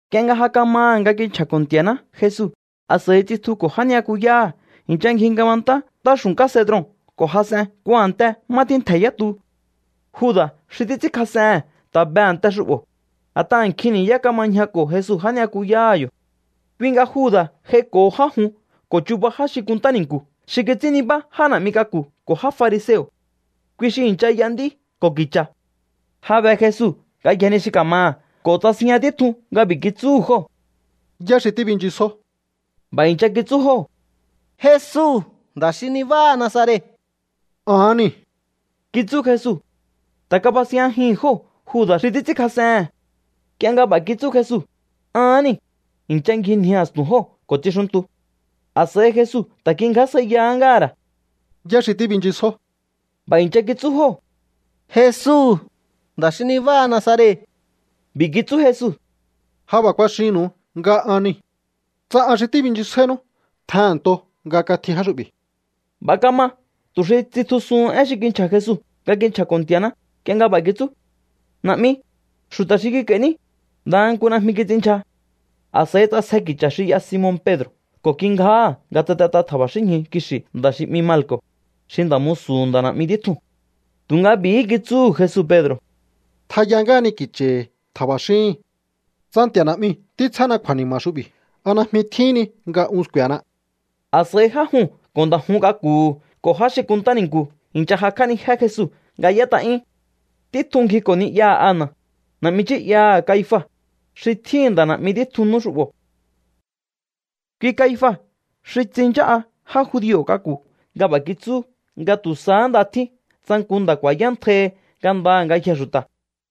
Nk'ie nga ja kamaha̱ nga kinchja̱ko̱ Nti̱a̱ná Jesu, a̱s'a̱i tsitjuko̱ já ni'yakuyáha̱. I̱ncha ngji ngabantá ntáxu̱nká Cedron ko̱ jas'en nku a̱nte má tjíntje̱ yá tu. Juda̱ xi títs'ínkjas'ehe̱n ta̱ be a̱nte xu'bo̱, a̱t'aha̱ nkjin ni̱yá kama ñjako̱ Jesu já ni'yakuyáha̱ yo̱. Kui nga Juda̱ j'aiko̱ho já jun ko̱ chuba já xi kunntá ni̱nku̱ xi kits'ín nibá já na̱'mi k'aku̱ ko̱ já fariseo̱. Kui xi i̱ncha y'a nd'í ko̱ ki̱cha̱. Ja be Jesu ngayjee̱ ni xi ka̱maha̱ ko̱ tsasinjña títjun nga b'i̱ kitsúhu̱ jóo̱: —¿Yá xi tíbinchisjó? B'a̱ i̱ncha kitsú jóo̱: —Jesu, nda̱ xi nibáha Nazaret. —Ahán niu̱ —kitsú Jesu. Ta̱ kabasinjñajihi̱n jóo̱ Juda̱ xi títs'ínkjas'ehe̱n. Nk'ie nga b'a̱ kitsú Jesu: “Ahán niu̱”, i̱ncha ngjinji a̱stu̱n jóo̱ ko̱ tsixuntu. A̱s'a̱i Jesu ta̱ kingjásjaiyahá ngáha̱ ra̱: —¿Yá xi tíbinchisjó? B'a̱ i̱ncha kitsú jóo̱: —Jesu, nda̱ xi nibáha Nazaret. B'i̱ kitsú Jesu: —Ja b'a̱ kuaxinnu̱u nga ahán niu̱. Tsa an xi tíbinchisjáínú, tjehe̱nnto nga katji já xu'bi̱. B'a̱ kama tu̱ xi tsitjusuhun én xi kinchja̱ Jesu nga kinchja̱ko̱ Nti̱a̱ná nk'ie nga b'a̱ kitsú: “Na̱'mi, xu̱ta̱ xi kik'a̱i̱ní, ndaha nku najmi kits'inndyja.” A̱s'a̱i ts'asje ki̱cha̱ xi y'a Simon Pedro̱ ko̱ kingjáha̱ nga tsatet'a tja̱ba̱xínñju kixi̱ nda̱ xi 'mi Malco̱, xi nda̱ musu̱hu̱ nda̱ na̱'mi títjuu̱n. Tu̱nga b'i̱hí kitsúhu̱ Jesu Pedro̱: —Tjaya ngáhani ki̱cha̱hi̱ tja̱ba̱xíhi̱n. Tsa Nti̱a̱ Na̱'miu̱ títsjána kju̱a̱ni̱ma̱ xu'bi̱, ¿a najmi tjíhín ni nga un sku̱e̱na? A̱s'a̱i já juu̱n ko̱ nda̱ jun k'aku̱hu̱ ko̱ já xi kunntá ni̱nku̱ i̱ncha jakj'ánijé Jesu nga y'ét'a'yún. Títjun ngjiko̱ ni'yaha̱ Ana, na̱'mi nchí'yaha̱ Caifa, xi tjíhi̱n nda̱ na̱'mi títjun nú xu'bo̱. Kui Caifa xi tsinchá'a já judio̱ k'aku̱ nga b'a̱ kitsú nga tu̱ sahá nda tjín tsa nku nda̱ ku̱a̱yántjai ngandaha̱ ngayjee̱ xu̱ta̱.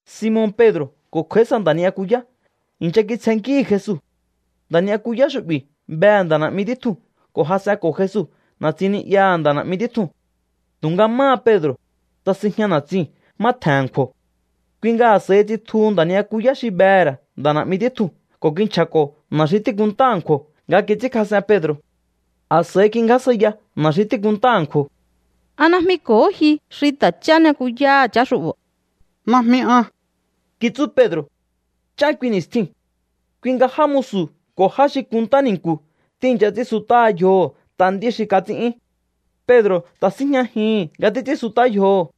Simon Pedro̱ ko̱ kj'a̱í sa nda̱ ni'yakuyá i̱ncha kitsjennkíhi̱ Jesu. Nda̱ ni'yakuyá xu'bi̱ behe̱ nda̱ na̱'mi títjuu̱n ko̱ jas'enko̱ Jesu na̱tsin ni'yaha̱ nda̱ na̱'mi títjuu̱n. Tu̱nga máha Pedro̱, tsasinjña na̱tsiu̱n má tje̱n a̱nkju̱o̱. Kui nga a̱s'a̱i tsitjuhu nda̱ ni'yakuyá xi behe̱ ra̱ nda̱ na̱'mi títjuu̱n ko̱ kinchja̱ko̱ na̱ xi tíkunntá a̱nkju̱o̱ nga kits'ínkjas'en Pedro̱. A̱s'a̱i kingjásjaiya na̱ xi tíkunntá a̱nkju̱o̱: —¿A najmi ko̱hó ji xi ta̱ chá ni'yakuyáha̱ chá xu'bo̱? —Najmi an —kitsú Pedro̱. Nch'án kui ni̱stjiu̱n. Kui nga já musu̱ ko̱ já xi kunntáha ni̱nku̱ tíi̱ncha ts'ínsut'áha yjoho̱ t'a nd'í xi kats'ín'yún. Pedro̱ ta̱ síjñajihi̱n nga títs'ínsut'á yjoho̱.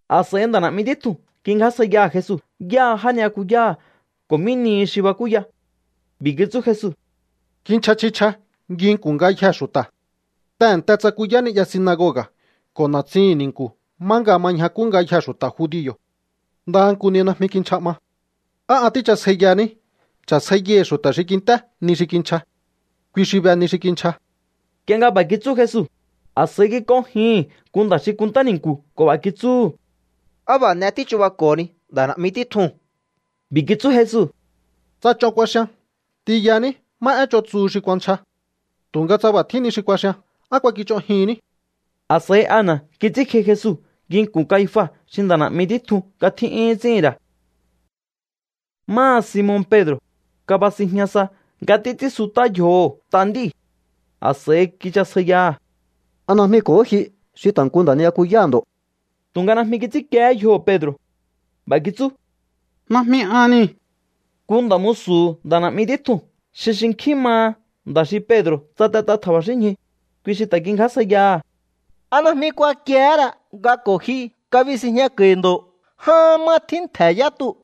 A̱s'a̱i nda̱ na̱'mi títjuu̱n kingjásjaiyaha̱ Jesu yáha já ni'yakuyáha̱ ko̱ mí nihi xi bakúya. B'i̱ kitsú Jesu: —Kinchja chji chja nginku̱n ngayjee̱ xu̱ta̱. Tehe̱nte tsakuyá ni'ya sinagoga̱ ko̱ na̱tsihi̱n ni̱nku̱ má nga ma ñjakú ngayjee̱ xu̱ta̱ judio̱. Ndaha nku ni najmi kinchja 'ma. ¿Á an tíchasjaiyahaní? Cha̱sjaiyaihi̱ xu̱ta̱ xi kint'é ni xi kinchja. Kui xi be ni xi kinchja. Nk'ie nga b'a̱ kitsú Jesu, a̱s'a̱i kik'onjihi̱n nku nda̱ xi kunntá ni̱nku̱ ko̱ b'a̱ kitsúhu̱: —¿Á b'a̱ n'e tíchubako̱honi nda̱ na̱'mi títjuu̱n? B'i̱ kitsú Jesu: —Tsa ch'on kuaxian, t'inyaní má én ch'on tsuhu xi kuanchja. Tu̱nga tsa b'a̱ tjín ni xi kuaxian, ¿á kuakich'onjihinní? A̱s'a̱i Ana kits'ínkji Jesu nginku̱n Caifa xi nda̱ na̱'mi títjun nga tjín'yún ts'íhi̱n ra̱. Máha Simon Pedro̱, kabasinjña sa nga títs'ínsut'á yjoho̱ t'a nd'íu̱. A̱s'a̱i kichasjaiyaha̱: —¿A najmi ko̱hó ji xi ta̱ nku nda̱ ni'yakuyáha̱ ndo̱? Tu̱nga najmi kits'ínkiehé yjoho̱ Pedro̱. B'a̱ kitsú: —Najmi an niu̱. Nku nda̱ musu̱hu̱ nda̱ na̱'mi títjuu̱n xi xinkjín maha nda̱ xi Pedro̱ tsatet'a tja̱ba̱xínñju, kui xi ta̱ kingjásjaiyaha̱: —¿A najmi kuakiehé ra nga ko̱ ji kabisinjñako̱i̱ ndo̱ ján má tjíntje̱ yá tuu̱?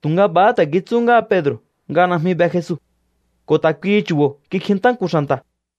Tu̱nga b'a̱há ta̱ kitsú ngáha Pedro̱ nga najmi be Jesu. Ko̱ ta̱ kuihi chu̱bo̱ kikjintá nku xa̱nta̱.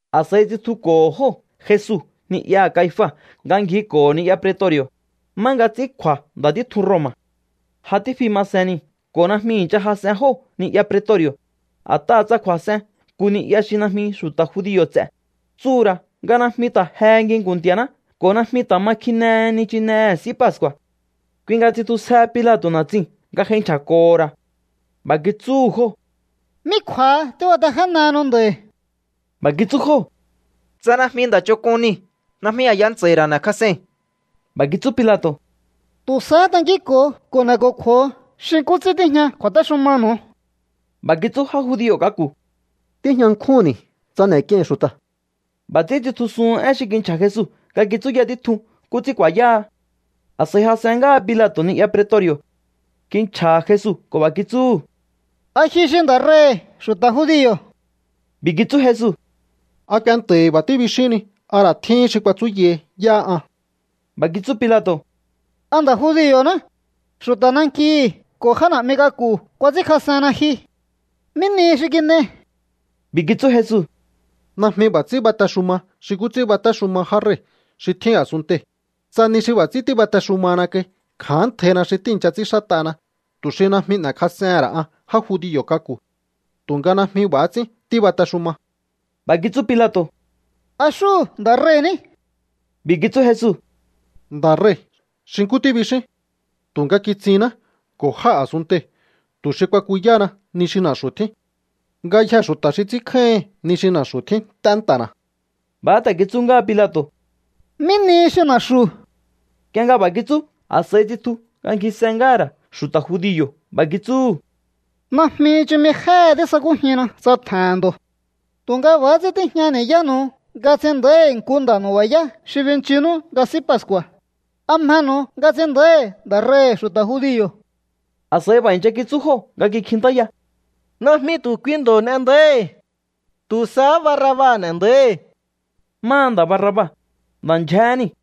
A̱s'a̱i tsitjuko̱ho̱ jóo̱ Jesu ni'yaha̱ Caifa nga ngjiko̱ho̱ ni'ya pretori̱o̱, má nga ts'ín kju̱a̱ nda̱ títjun Roma̱. Ja tífi ma sen niu̱ ko̱ najmi i̱ncha jas'en jóo̱ ni'ya pretori̱o̱, a̱t'aha̱ tsa kju̱a̱s'en nku ni'ya xi najmi xu̱ta̱ judio̱ ts'e̱, tsuhu̱ ra̱ nga najmi ta̱ jehe nginku̱n Nti̱a̱ná ko̱ najmi ta̱ ma kjinehe nichinehe̱ S'í Pascu̱a̱. Kui nga tsitjusjehe Pilato̱ na̱tsiu̱n nga j'ai nchja̱ko̱ho̱ ra̱. B'a̱ kitsúhu̱ jóo̱: —¿Mí kju̱a̱ha tíbatejénehenu nda̱i̱? B'a̱ kitsú jóo̱: —Tsa najmi nda̱ ch'onk'un niu̱, najmi a̱ya ntsa̱i̱ ra̱ n'e̱kjas'ei̱n. B'a̱ kitsú Pilato̱: —Tu̱ sahá tankínko̱o ko̱ n'e̱ko̱kju̱o̱o xi nkú ts'ín tíjña kju̱a̱téxumanu̱u. B'a̱ kitsú já judio̱ k'aku̱: —Tíjña nkjúnni̱ tsa n'e̱k'iei̱n xu̱ta̱. B'a̱ ts'ín tsitjusuhun én xi kinchja̱ Jesu nga kitsúya títjun nkú ts'ín ku̱a̱yáha. A̱s'a̱i jas'en ngáha Pilato̱ ni'ya pretori̱o̱. Kinchja̱ha̱ Jesu ko̱ b'a̱ kitsúhu̱: —¿A ji xi nda̱ rei̱hi̱ xu̱ta̱ judio̱? B'i̱ kitsú Jesu: —¿A kuenta̱hi̱ b'a̱ tíbixíhinni, a ra̱ tjíhín xi kuatsúyahi yáha an? B'a̱ kitsú Pilato̱: —¿A nda̱ judio̱ná? Xu̱ta̱ nankihi̱ ko̱ já na̱'mi k'aku̱ kuats'ínkjas'enna ji. ¿Mí nihi xi kin'ei? B'i̱ kitsú Jesu: —Najmi b'a̱ ts'ín batexuma xi nkú ts'ín batéxuma já rei̱ xi tjín a̱sunntei̱. Tsa ni xi b'a̱ ts'ín tíbatexumahana kai, kja̱ántjaina xi tíi̱ncha ts'ínxát'ana tu̱ xi najmi n'e̱kjas'ehe̱n ra̱ an já judio̱ k'aku̱. Tu̱nga najmi b'a̱há ts'ín tíbatexuma. B'a̱ kitsú Pilato̱: —¿A xúhu̱ nda̱ rei̱ ní? B'i̱ kitsú Jesu: —Nda̱ rei̱, xi nkú tíbixín. Tu̱nga kitsinná ko̱ jáa̱ a̱sunntei̱ tu̱ xi kuakuyáhana ni xi na̱xu̱ tjín. Ngayjee̱ xu̱ta̱ xi ts'ínkjáíhi̱n ni xi na̱xu̱ tjín nt'é nta̱na̱. B'a̱ ta̱ kitsú ngáha Pilato̱: —¿Mí nihi xi na̱xu̱? Nk'ie nga b'a̱ kitsú, a̱s'a̱i tsitju nga ngjise ngáha̱ ra̱ xu̱ta̱ judio̱. B'a̱ kitsúhu̱: —Najmi chumi jéhe tísakújinna tsa tje̱he̱n ndo̱. Tu̱nga b'a̱há ts'ín tíjña ni̱yánu̱u nga ts'in nda̱íhi̱ nku nda̱ nu̱ba̱yá xi binchinú nga S'í Pascu̱a̱. ¿A mjenu̱u nga ts'in nda̱íhi̱ nda̱ rei̱hi̱ xu̱ta̱ judio̱? A̱s'a̱i b'a̱ i̱ncha kitsú jóo̱ nga kikjintáya: —¡Najmi tu̱ kui ndo̱ n'e nda̱íhi̱! ¡Tu̱ sahá Barraba n'e nda̱íhi̱! Máha nda̱ Barraba, nda̱ ndyjéhé niu̱.